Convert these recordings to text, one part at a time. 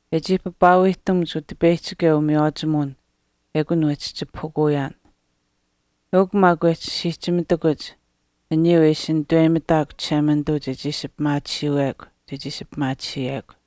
E chii papaawiihtamuch Utipeyihchikeu umiywaachimuwin ekun wehchi chipahukuyaan. Eukw maak wehchi siihchimitakuch aniyuu e ishi nitaweyimitaakw Chishemanituu chechii ishi pimaatisiiwekw chechii ishi pimaatisiyekw.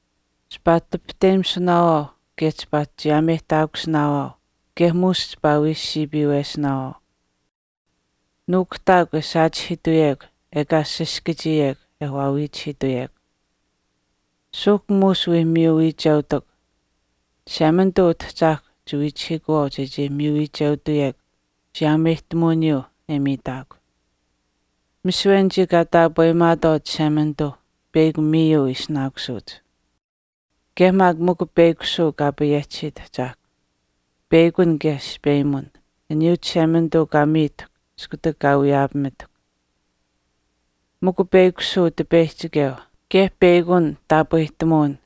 Chipaa tipihteyimisunaawaau kaye chipaa chiyaameyihtaakusinaawaau kaye muush chipaa wii siipiiwesinaawaau. Nuukuhtaakw e saachihiituyekw ekaa saskachiyekw e waawiichihiituyekw. Suuhk muush wii miyu wiicheutukw. Chishemanituu Utahchaahkwa chiwiichihiikuwaau chechii miyu wiicheutuyekw chiyaameyihtamuwiniyuu e miitaakw. Misiwe anichii kaa taapweyimaatwaau Chishemanituu peyakw miiyuu ishinaakusuuch. Kaye maak mikw peyakushuu Kaa payehchisiit Ahchaahkw. Peyakun kaye aspeyimuwin, aniyuu Chishemanituu kaa miitahkw iskutak kaa wiyaapamitahkw. Mikw peyakushuu Utipeyihchikeu, kaye peyakun taapwehtamuwin,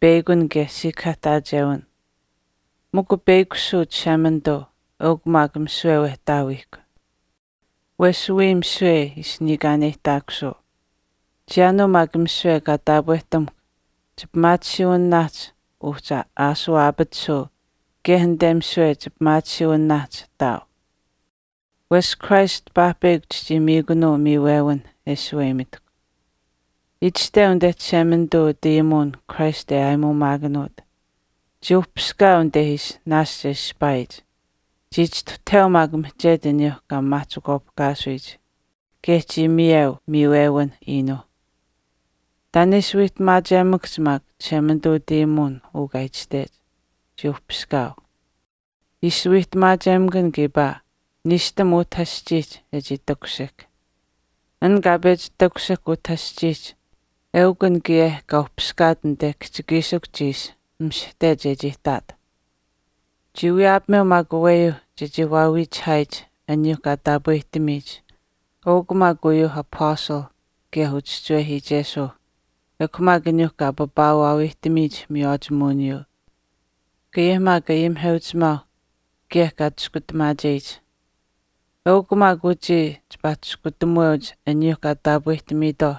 peyakun kaye siikahaahtaachewin. Mikw peyakushuu Chishemanituu, eukw maak uu misiwe Wehtaawiihkw. Wesh wiya misiwe ishi niikaaneyihtaakusuu. Chiyaanuu maak misiwe kaa taapwehtamuhkw chipimaatisiiwinaahch uhchi aashuu aapatisuu kaye anite misiwe chipimaatisiiwinaahch ihtaau. Wesh Christ paahpeyakw chichii miikunuu miiwewinh e shaweyimitahkw. Itashteu anite Chishemanituu utayimuwinihch Christ e aayimuumaakanuut, Chii uhpiskaau anite ishi naashch e ishpaayich, chii chistuhtaheu maak mihchetu aniyuu kaa maamaahchikwaapihkaasuyitwaauh. Kaye chii miyeu miiwewinh iinuuh. Taan e ishi wiihtamaachemakahch maak Chishemanituu utayimuwin uu kaa itashtech, “Chii uhpiskaau.” Ishi wiihtamaachemakan kiipaa niishtam utah aschiihch e chii takushihk. An kaa pechi takushihk utah aschiihch eukw an kaye kaa uhpiskaat anite kihchikiishikuhch ishi mishihte chechii ihtaat. Chii wiyaapameu maak aweyuu chechii waawiichihaayich aniyuu kaa taapwehtamiitwaauh eukw maak uyuuh Apastalih kaye uchischiwehiichesuuh ekw maak aniyuu kaa papaawaawiihtamiyich miywaachimuwiniyuu kaye maak ayimiheuchimaauh kaye kaa Chiskutamaacheyich. Eukw maak uchii chipaa chiskutamuweuch aniyuuh kaa taapwehtamiitwaauh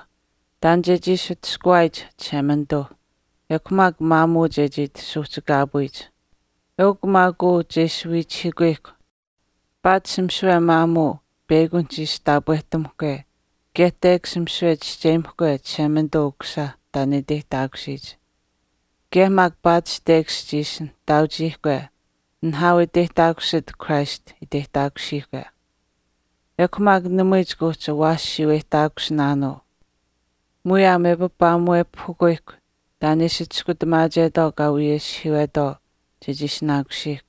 taan chechii ishi atushkuwaayich Chishemanituu ekw maak maamuu chechii ati suuhchikaapuyich. Eukw maak uu che ishi wiichihiikuyihkw paatish misiwe maamuu peyakunihch ishi taapwehtamuhkwe kaye tekash misiwe chischeyimahkwe Chishemanituu Ukusisa taan e iteyihtaakusiyich. Kaye maak paatish tekash chiishi nihtaauchiihkwe, nihaau e iteyihtaakusit Christ iteyihtaakusiihkwe. Ekw maak namui chika uhchi awaashiyuuweyihtaakusinaanuu. Muyaam e papaamuwepahukuyihk taan e ishi Chiskutamaachetwaau kaa wiyeshihiiwetwaau chechii ishinaakusiihkw,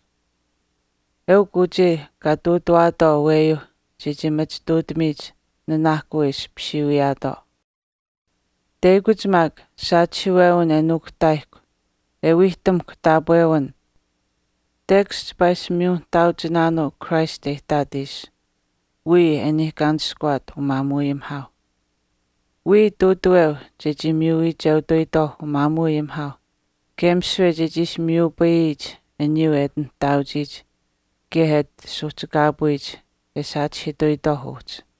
eukw uchii kaa ihtuutuwaatwaau aweyuu chechii machituutamiyich nanaahkuu e ishi pisiiwiyaatwaau. Teyakuch maak, saachihiiwewin e nuukuhtaayihkw e wiihtamuhkw taapwewin, tekash chipaa ishi miyu nihtaauchinaanuu Christ e ihtaat ishi, wiya e niikaanishkuwaat umaamuuayimihaauh. Wiya ihtuutaweu chechii miyu wiicheutuyitwaauh umaamuuayimihaauh kaye misiwe chechii ishi miyupayiyich aniyuu e ati nihtaauchiyich kaye e ati suuhchikaapuyich e saachihiituyitwaau uhchi.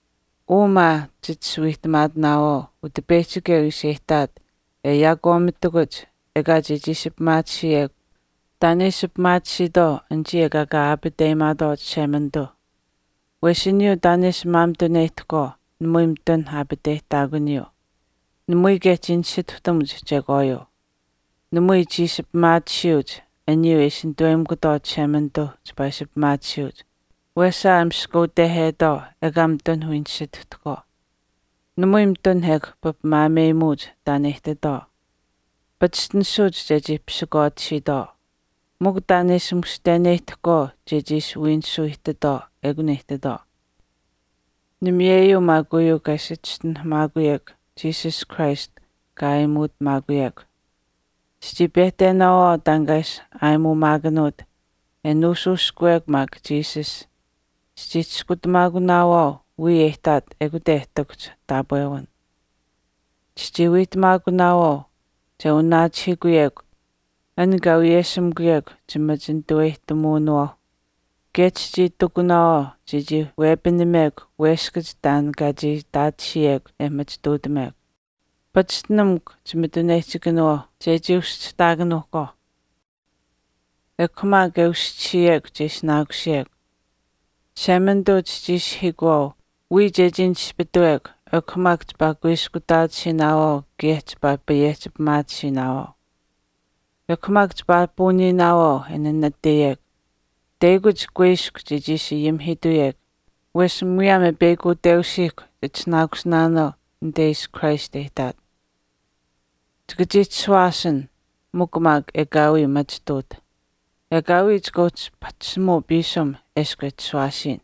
Uu maa chit ishi wiihtamaatinaawaau Utipeyihchikeu ishi e ihtaat e yaakwaamitakuch ekaa chechii ishi pimaatisiyekw taan e ishi pimaatisiitwaau anichii ekaa kaa aapateyimaatwaau Chishemanituu. Wesh aniyuu taan e ishi maamituneyihtahkwaau namui mitun aapateyihtaakuniyuu, namui kaye chii nisituhtamuch chekwaayuu. Namui chii ishi pimaatisiyuuch aniyuu e ishi nituweyimikutwaau Chishemanituuh chipaa ishi pimaatisiyuuch, wesaa e maskutehetwaau ekaa mitun wii nisituhtahkwaau. Namui mitun ekw papimaameyimuuch taan e ihtitwaau. Pachishtinisuuch chechii pisikwaatisiitwaau, mikw taan e ishi mushteneyihtahkwaau chechii ishi wiinisuu ihtitwaau ekun e ihtitwaau. Namiyeyuu maak uu kaa ishi chischinuhamaakuyekw Jesus Christ kaa aayimuutamaakuyekw. Chichii pehtenaawaau taan kaa ishi aayimuumaakanuut, e nuushuushkuwekw maak Jesus chichii chiskutamaakunaawaau wiya e ihtaat ekute e ihtakuhch taapwewin. Chichii wiihtamaakunaawaau che wanaachihiikuyekw an kaa wiyeshimikuyekw chimachinituweyihtamuwinawaauh, kaye chichii itikunaawaau chechii wepinamekw weskach taan kaa chii itaatisiyekw e machituutamekw. Pachishtinamukw chimituneyihchikanawaauh chechii uschihtaakanuuhkwaau, ekw maak e uschisiyekw che ishinaakusiyekw. Chishemanituu chichii ishihiikuwaau wiya chechii nispituwekw ekw maak chipaa kuiskutaatisiinaawaau kaye chipaa payehchi pimaatisiinaawaau. Ekw maak chipaa puuniinaawaau e nanataiyekw teyakuch kuiskw chechii ishi ayimihiituyekw wesh muyaam e peyakuteusiihkw chitishinaakusinaanuu anite ishi Christ e ihtaat. Chika chii chishuwaasin mikw maak ekaawii machituutaht. Ekaawii chika uhchi ati pahchishimuu piisim eshkw e chishuwaasiyin.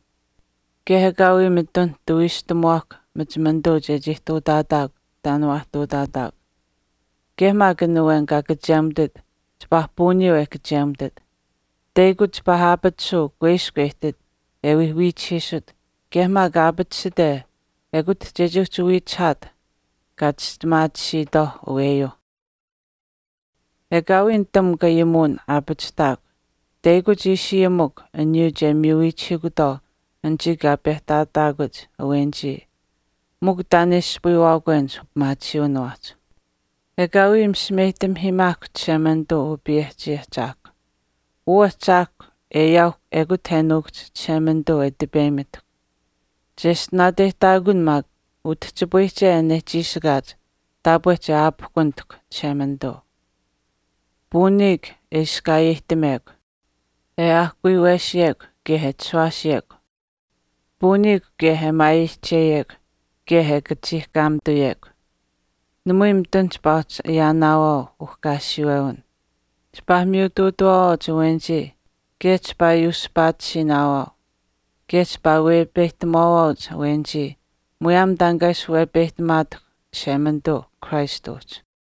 Kaye ekaawii mitun tawiishtamuwaahkw machimanituu chechii ihtuutaataakw taan waa ihtuutaataakw. Kaye maak an awen kaa kachemutit chipaa puuniyuu e kachemutit. Teyakuch chipaa aapatisuu kuiskw e ihtit e wii wiichihiisut kaye maak aapatisite ekute chechii uhchi wiichihaat kaa kachistimaatisiitwaauh aweyuuh. Ekaawii nitamukw ayimuwin aapachihtaakw, teyakuch ishi ayimukw aniyuu che miyu wiichihiikutwaau anichii kaa pehtaataakuch awenichii mikw taan e ispayiwaakwenich upimaatisiiwinawaahch. Ekaawii misimeyihtamahiimaakw Chishemanituu Upayehchii Ahchaahkwa. Uu Ahchaahkw e ayaauhkw ekut e nuukuhch Chishemanituu e tipeyimitahkw. Cheshtinaateyihtaakun maak utihchipayihche an e chiishikaach taapwe che aapihkunitahkw Chishemanituu. Puuniikw e iskaayeyihtamekw, e aahkuyuwesiyekw kaye e chishuwaasiyekw. Puuniikw kaye e maayeyihcheyekw kaye e kachiihkaamituyekw. Namui mitun chipaa uhchi ayaanaawaau uhkaasiwewin. Chipaa miyutuutawaawaauch awenichii kaye chipaa yuuspaatisiinaawaau. Kaye chipaa wepeyihtamuwaawaauch awenichii muyaam taan kaa ishi wepeyihtamaatahkw Chishemanituu Christ uhchi.